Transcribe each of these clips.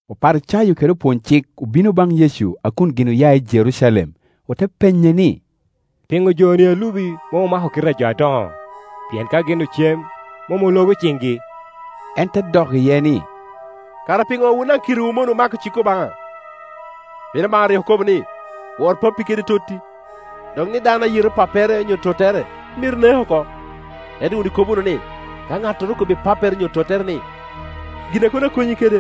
Oparicayo kede opwony-cik obino baŋ Yecu a kun gin oya i Jerucalem, ote penye ni, “Piŋo joni a lubi mom omako kite a jo adoŋo? Pien ka gin ocem, mom ologo ciŋgi?” En te dok iye ni, “Kara piŋo wun daŋ kitewu omonowu mako cik Obaŋa? Pien Obaŋa rik okobo ni, ‘Wor pappi kede totti’, dok ni, ‘Dano a yeto pappere onyo tottere myero nek oko,’ Ento wun ikobo wunu ni, ‘Ka ŋattoro okobbi pappere onyo tottere ni, Gin a kono akonyi kede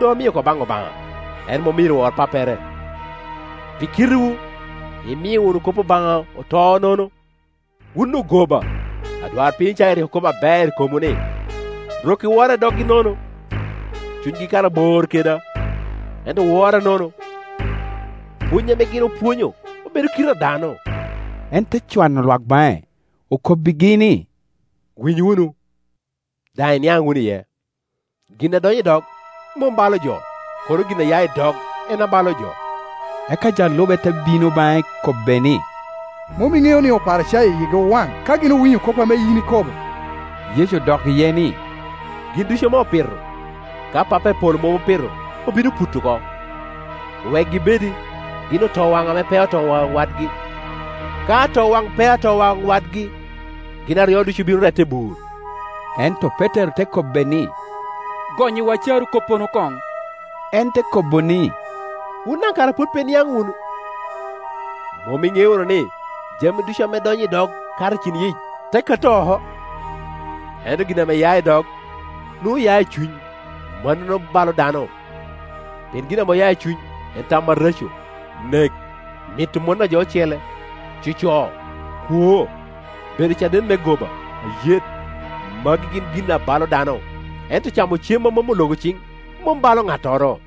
doŋ amio oko baŋ Obaŋa, en mom myero wor pappere.’ Pi kitewu imio wunu kop Obaŋa oto nono. Wun ogoba! Adwarpiny Icaya rik okobo aber i komwu ni, ‘Rok-ki wora i doggi nono, cunygi kara bor keda; ento owora nono, pwony ame gin opwonyo obedo kite a dano.’” En te cwano lwak baŋe, okobbigi ni, “Winy wunu, daŋ iniaŋ wunu iye. Gin a donyo i dog mom balo jo, kono gin a ya i dog en abalo jo.” Eka jo a lube te bino baŋe kobbe ni, “Mom iŋeo ni Oparicayo yigi owaŋ ka gin owinyo kop ame yin ikobo?” Yecu odok iye ni, “Gin ducu ame opito, ka Pappa i polo mom opito, obino puto oko. Wekgi obedi. Gin otowaŋ ame peo otowaŋ wadgi. Ka atowaŋ peo atowaŋ wadgi, gin aryo ducu obino rette i bur.” Ento Petero te kobbe ni, “Gonnyiwa carokoppono koŋ.” En te kobo ni, “Wun daŋ kara pwod pe iniaŋ wunu? Mom iŋeo wunu ni, jami ducu ame donyo i dog kato i cin-yic, te kato oko? Ento gin ame ya i dog, nwoŋo oya i cuny, mannono balo dano. Pien gin ame oya i cuny, en tam areco, nek, mito mon a jo ocele, coco kwo, bedo caden me goba, ayet. Magu gin gin abalo dano; ento camo cem a mom ologo ciŋ mom balo ŋattoro.”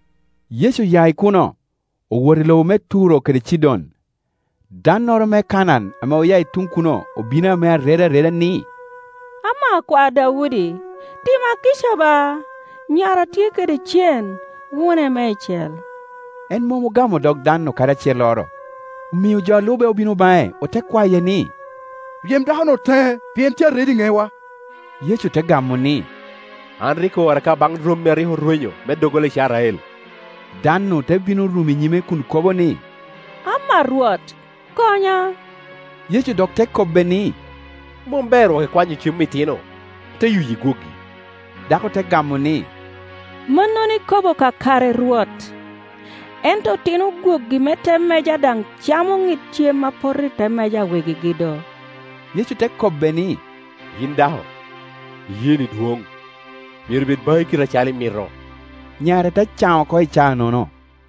Yecu oya i kuno, owoto i lobo me Turo kede Cidon. Dannoro me Kanaan ame oya i tuŋ kuno obino ame aredo areda ni, “Ama Rwot, akwar Daudi, tima kica ba; nyara tye kede cen, wune meicel.” En mom ogamo dog dan-nu kadi acelloro, omio jo a alube obino baŋe ote kwaye ni, “Ryem dakonu teŋe, pien tye a redo i ŋewa.” Yecu te gamo ni, “An rik oora ka baŋ rommi a rik orwenyo me doggola Icrael.” Dan-nu te bino rumo i nyime kun kobo ni, “Ama Rwot, konya.” Yecu dok te kobbe ni, “Mom ber wok ikwanyo cem itino, ote yuyi gwogi.” Dako te gamo ni, “Mannono ikobo kakare, Rwot; ento otino gwogi me te meja daŋ camo ŋid cem a poto i te meja a wegigi do.” Yecu te kobe ni, “Yin dako, iyeeni dwoŋ. Myero bed baŋi kite acalo imito.” Nyare te can oko i caa-nono.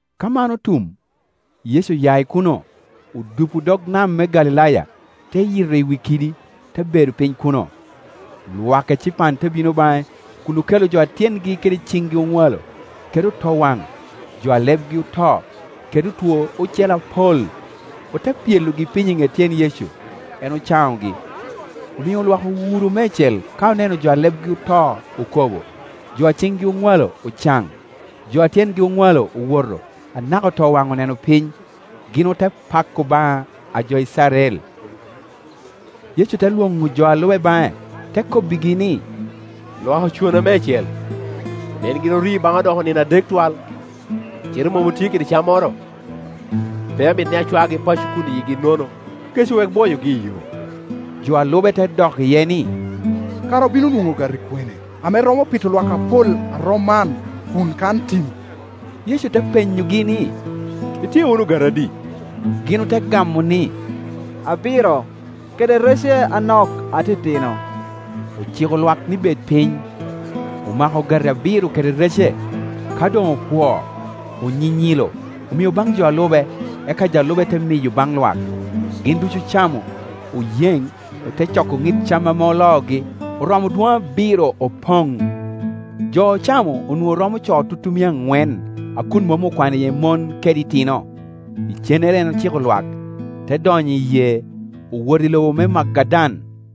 Ka man otum, Yecu oya i kuno, odupo dog nam me Galilaya, te yito i wi kidi, te bedo piny kuno. Lwak ecipan te bino baŋe kun okelo jo a tyengi kede ciŋgi oŋwalo, kede otowaŋ, jo alebgi oto, kede otwo acele apol, ote pyelogi piny i ŋet tyen Yecu, en ocaŋogi. Omio lwak owuro meicel ka oneno jo a lebgi oto oko bo, jo a ciŋgi oŋwalo ocaŋ, jo a tyengi oŋwalo owoto, anaka otowaŋ oneno piny; gin ote pako Obaŋa a jo Icrael. Yecu te lwoŋo jo a lube baŋe, te kobbigi ni, “Lwak ocona meicel, pien gin orio baŋa odoko nino adek twal, cite mom otye kede cammoro. Pe amito ni acwagi paco kun yigi nono, kec owek bwoyogi iyo.” Jo a lube te dok iye ni, “Kara obino nwoŋo ogati kwene ame romo pito lwak apol rom man a kun kan tim?” Yecu te penyogi ni, “Itye wunu ogati adi?” Gin ote gamo ni, “Abiro, kede rece anok atitino.” Ociko lwak ni bed piny, omako ogati abiro kede rece, ka doŋ opwoo, onyinyilo, omio baŋ jo a lube, eka jo a lube te miyo baŋ lwak. Gin ducu ocamo, oyeŋ, ote coko ŋid cam ame oloogi, oromo dwoŋ abiro opoŋ. Jo ocamo onwoŋo romo co tutumia aŋwen, a kun mom okwano iye mon kede itino. Icennere en ociko lwak, te donyo i yee, owoto i loba me Magadan.